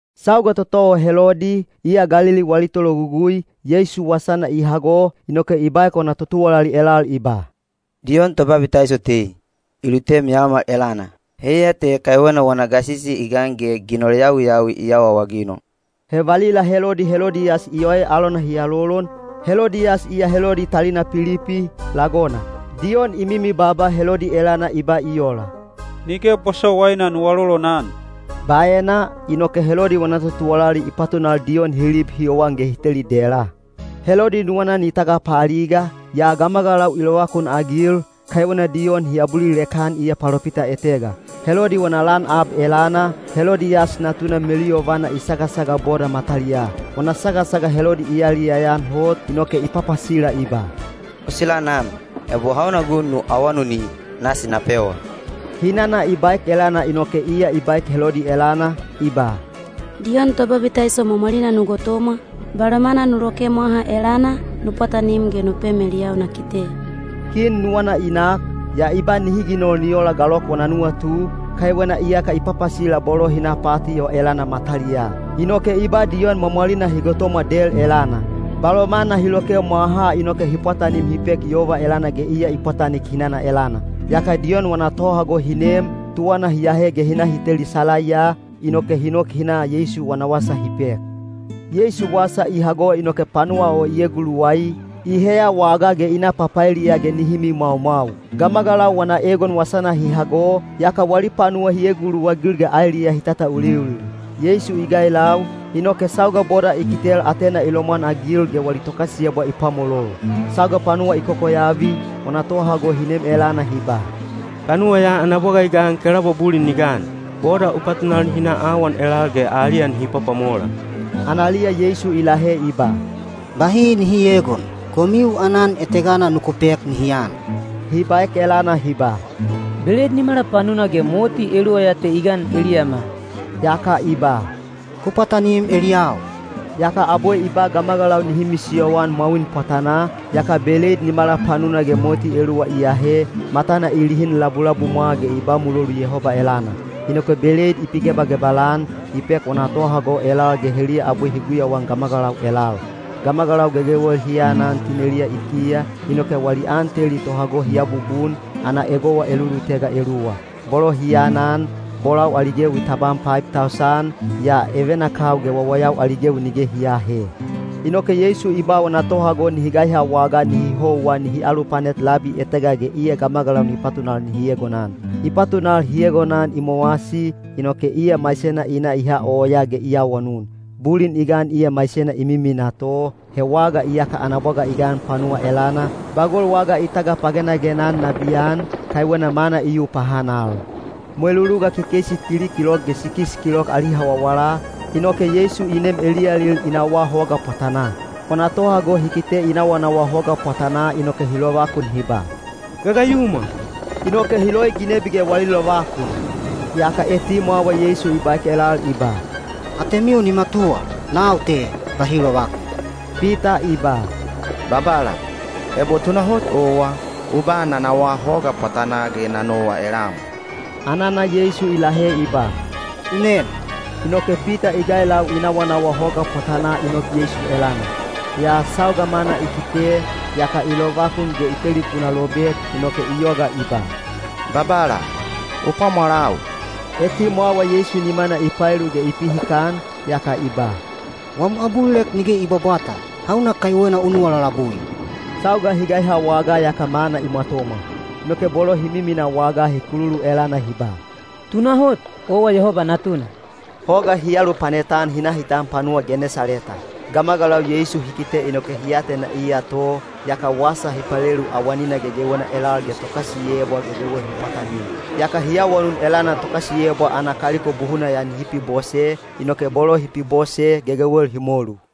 Sauga toto o Helodi, iya Galili wali tologugui, Yeisu wasana i hago, inoke i baek wana totuwalali elal i ba, “Diyon Tobabitaiso tei, i lutem yaomal elana. Heiya te kaiwena wana gasisi i gan ge ginol yawiyawi i awaawaginol.” He valila Helodi Helodiyas i oe alona hi alolon, Helodiyas iya Helodi talina Pilipi, lagona. Diyon i mimi baaba Helodi elana i ba i ola, “Nige bosowaina nu alolonan.” Baena, inoke Helodi wana totuwalali i patunal Diyon hi lib hi yowan ge hi teli dela. Helodi nuwana ni tagapaaliga, yaa gamagalau i lovakunagil, kaiwena Diyon hi abulilek-an iya palopita etega. Helodi wana lan ab elana, Helodiyas natuna meluyovana i sagasaga boda mataliyaa. Wana sagasaga Helodi i yaliyaya-an hot, inoke i papasila i ba, “O sila nam, ebo hauna gun nu awanuni, nasi na pewa.” Hinana i baek elana inoke iya i baek Helodi elana, i ba, “Diyon Tobabitaiso mwamwalina nu gotomwa, balomana nu loke mwaha elana, nu pwatanim ge nu pem eliyau na kite.” Kin nuwana i nak, yaa i ba nihi ginol ni ola galok wana nuwatu, kaiwena iyaka i papasila bolo hi na pati o elana mataliyaa. Inoke i ba Diyon mwamwalina hi gotomwa del elana. Balomana hi loke mwahaa inoke hi pwatanim hi pek yova elana ge iya i pwatanik hinana elana. Yaka Diyon wana tohago hi nem, tuwana hi ahe ge hi na hi teli salaiya, inoke hi nok hi na Yeisu wana wasa hi pek. Yeisu wasa i hago inoke panuwa o i eguluwai, i heya wagaa ge hi na papaeliya ge nihi mimwaumwau. Gamagalau wana egon wasana hi hago, yaka wali panuwa hi eguluwagil ge aeliyaa hi tatauliulil. Yeisu i gailau, inoke sauga boda i kitel, atena i lomwanagil ge wali tokasiyebwa i pwamolol. Sauga panuwa i kokoyavi, wana tohago hi nem elana hi ba, “Panuwa ya ana bwaga i gan ge kelaubwa bulin ni gan. Boda u patunal nihi na awan elal ge aliya nihi pwapwamola.” Analiya Yeisu i lahe i ba, “Bahi nihi eegon. Komiu aanan etegana nuku pek nihi an.” Hi baek elana hi ba, “Beleid nimala panuna ge moti eluwa ya te i gan eliyama.” Yaka i ba, “Ku pwatanim eliyau.” Yaka abwe i ba gamagalau nihi misiyoan mwawin pwatanaa, yaka beleid nimala panuna ge moti eluwa i ahe, matana i lihin labulabumwa ge i ba mulolu Yehoba elana. Inoke beleid i pigebagebal-an, i pek wana tohago elal ge heliya abwe hi guyauan gamagalau elal. Gamagalau gegewel hi anan tineliya i kiya, inoke wali an teli tohago hi abubun, ana egowa elulutega eluwa. Bolo hi anan, bolau ali gewi tabam paib tausan, yaa evenakau ge wawayau ali gewi nige hi aahe. Inoke Yeisu i ba wana tohago nihi gaiha wagaa nihi houwa nihi alupanet labi etega ge iya gamagalau ni patunal nihi egonan. I patunal hi egonan i mowasi, inoke iya maisena i na i ha oyaa ge i awanun. Bulin i gan iya maisena i miminaa to, he waga iyaka ana bwaga i gan panuwa elana, bagol waga i tagapagenagena-an nabiyan, kaiwena mana i yu pahanal. Mweluluga kekeisi tili kilok ge sikis kilok ali hawawala, inoke Yeisu i nem eliyalil i nawaa hoga pwatanaa. Wana tohago hi kite i nawanawa hoga pwatanaa inoke hi lovakun hi ba, “Gagayumwa!” Inoke hi loi ginebi ge wali lovakun. Yaka etimwawa Yeisu i baek elal i ba, “Atemiu ni matuwa! Nau te. Bahi lovakun!” Pita i ba, “Babala, ebo tunahot owa, u ba na nawaa hoga pwatanaa ge na nowa elam.” Anana Yeisu i lahe i ba, “U nem.” Inoke Pita i gailau i nawanawa hoga pwatanaa ni nok Yeisu elana. Yaa sauga mana i kite, yaka i lovakun ge i telipuna lobek, inoke i yoga i ba, “Babala, u pwamwalau!” Etimwawa Yeisu nimana i paelu ge i pihikan, yaka i ba, “Wam abulilek nige i bwabwata! Hauna kaiwena u nuwa lalabui?” Sauga hi gaiha wagaa yaka mana i mwatomwa. Inoke bolo hi miminaa wagaa hi kululu elana hi ba, “Tunahot, owa Yehoba Natuna.” Hoga hi alupanet-an hi na hi tan panuwa Genesaleta. Gamagalau Yeisu hi kite inoke hi atena iya to, yaka wasa hi palelu awanina gegewena elal ge tokasiyebwa gegewel hi pwatanim. Yaka hi awanun elana tokasiyebwa ana kaliko buhuna ya nihi pibose, inoke bolo hi pibose, gegewel hi molu.